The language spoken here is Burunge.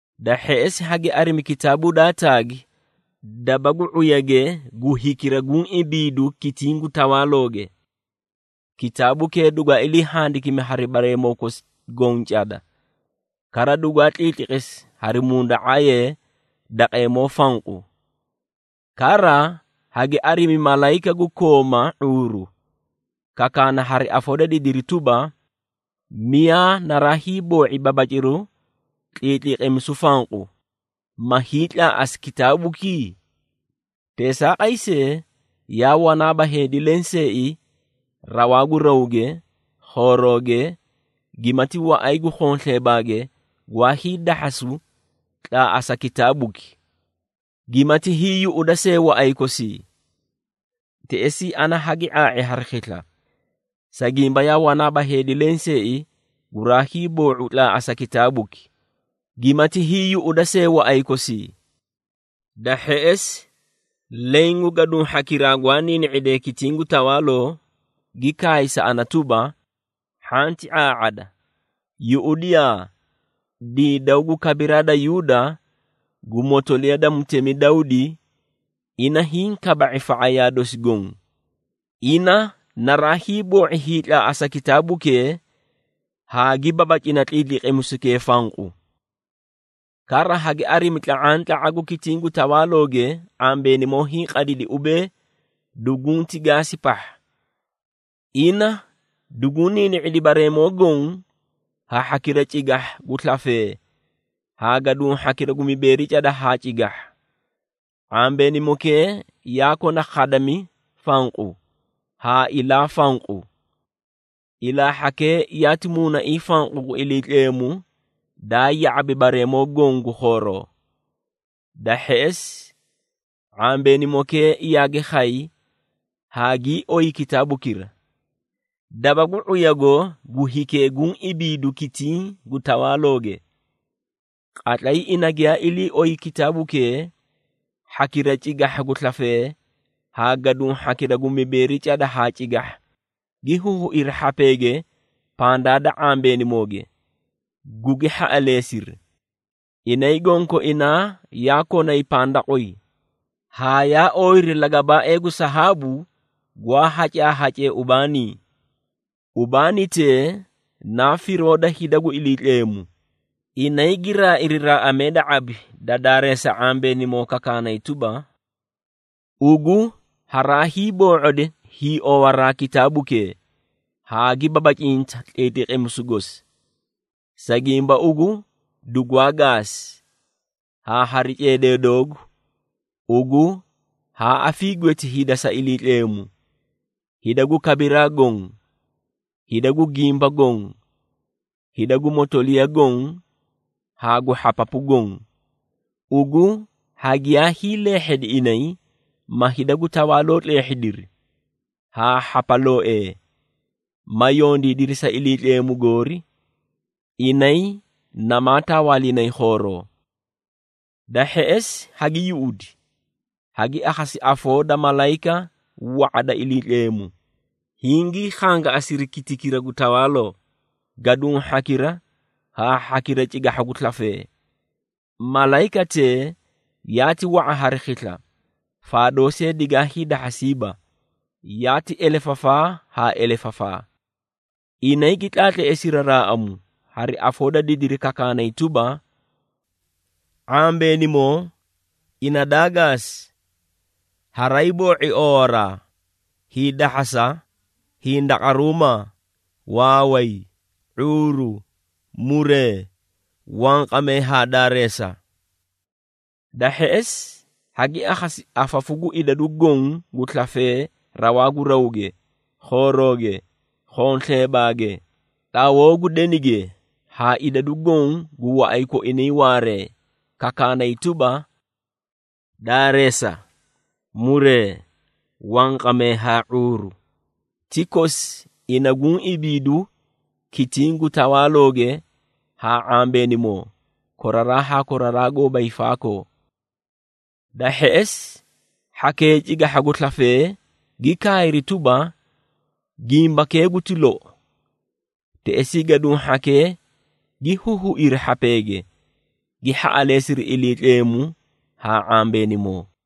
Da hheꞌesi, hagi arimi kitaabuu daa taagi daba gu ⁄uyage gu hikira guũ ibiidu kitiĩ gu tawaalooge. Kitaabukee dugwaa ilii handikimi hari bareemoo kosi goõ cada, kara dugwaa tliitliqisi hari munda⁄aayee daqeemoo fanqu. Kara hagi arimi malayika gu kooma ⁄uuru, kakaana hari afoo da didiri tuba, “Miyaa naraa hiiboo⁄i babaciru tliitliqimisu fanqu, ma hiitlaaꞌasi kitaabuki?” Teesaaqay see, yaa wanaaba heedi lenseei rawaa gu rawge, khooroge, gimati waꞌay gu khonsleebaage gwaa hiidahhasu tlaaꞌasa kitaabuki, gimati hiiyuꞌuda see waꞌay kosii. Teꞌesii, ana hagi ⁄aa⁄i hari khisla, sa gimba yaa wanaaba heedi lenseei guraa hiiboo⁄u tlaaꞌasa kitaabuki, gimati hiiyuꞌuda see waꞌay kosii. Da hheꞌesi, leẽ gu gaduũ hhakiraa gwaa niini⁄idee kitiĩ gu tawaaloo, gi kaay sa ana tuba, “Hhanti ⁄aa⁄ada! Yuꞌudiyaa, Diidaw gu kabiraa da Yuuda, gu motoliya da mutemi Dawdi, ina hiĩ kaba⁄i fa⁄ayaa dosi goõ. Ina naraa hiiboo⁄i hiitlaaꞌasa kitaabukee haa gi babacina tliitliqimisukee fanqu.” Kara, hagi arimi tla⁄antla⁄a gu kitiĩ gu tawaalooge, ⁄ambeenimoo hiĩ qadidi ubee dugunti gaasi pahha. Ina duguũ niini⁄idi bareemoo goõ ha hhakira cigahha gu slafee haa gaduũ hhakira gu mibeeri cada haa cigahha. ⁄ambeenimokee yaa kona khadami fanqu haa ilaa fanqu. Ilaa hhakee yaati Muunaiĩ fanqu gu Iliitleemu daa ya⁄abi bareemoo goõ gu khooroo. Da hheꞌesi, ⁄ambeenimokee yaagi khay haa gii oyi kitaabukira, daba gu ⁄uyago gu hikee guũ ibiidu kitiĩ gu tawaalooge. Qatlay ina giyaa ilii oyi kitaabukee, hhakira cigahha gu slafee, haa gaduũ hhakira gu mibeeri cada haa cigahha, gi huhuiri hhapeege pandaa da ⁄ambeenimooge, gugi hhaꞌaleesiri. Inay gonkoinaa yaa konay pandaqway, haa yaa ooyiri lagabaaee gu sahaabu gwaa hacaahacee ubaanii. Ubaanitee naa firoo da hida gu Iliitleemu. Inay gi raairi raaꞌamee da ⁄abi da daareesa ⁄ambeenimo kakaanay tuba, “Ugu haraay boo⁄odi hiiowaraa kitaabukee, haa gi babacinta tliitliqimisu gosi. Sa gimba ugu dugwaa gaasi, haa hari ceedee doogu, ugu haa afiigweeti hida sa Iliitleemu, hida gu kabiraa goõ, hida gu gimba goõ, hida gu motoliya goõ haa gu hhapapu goõ. Ugu hagiyaa hiileehhedi inay, ma hida gu tawaaloo tleehhidiri, haa hhapalooee, ma yondiidiri sa Iliitleemu goori, inay namaa tawaalinay khooroo.” Da hheꞌesi hagi yuꞌudi, hagi akhasi afoo da malayika wa⁄a da Iliitleemu, hingii khangaꞌasiri kitikira gu tawaaloo, gaduũ hhakira haa hhakira cigahha gu slafee. Malayikatee yaati wa⁄a hari khisla, faadoo see digaa hiidahhasiiba, yaati elefafaa haa elefafaa. Inay gi tlaatleesiri raaꞌamu, hari afoo da didiri kakaanay tuba, “⁄ambeenimoo ina daa gaasi, haraay boo⁄i oowaraa, hiidahhasa, hindaqaruumaa, waaway, ⁄uuru, muree wanqamee haa daareesa.” Da hheꞌesi, hagi akhasi afafu gu idadu goõ gu slafee rawaa gu rawge, khoorooge, khonsleebaage, tlawoo gu denige haa idadu goõ gu waꞌay koinay waaree, kakaanay tuba, “Daareesa, muree, wanqamee haa ⁄uuru, ti kosi ina guũ ibiidu kitiĩ gu tawaalooge haa ⁄ambeenimoo, koraraa haa koraraa goóba hiifaakoo!” Da hheꞌesi, hhakee cigahha gu slafee, gi kaayri tuba, “Gimbakee guti lou!” Teꞌesii gaduũ hhakee gi huhuiri hhapee, gi hhaꞌaleesiri Iliitleemu haa ⁄ambeenimoo.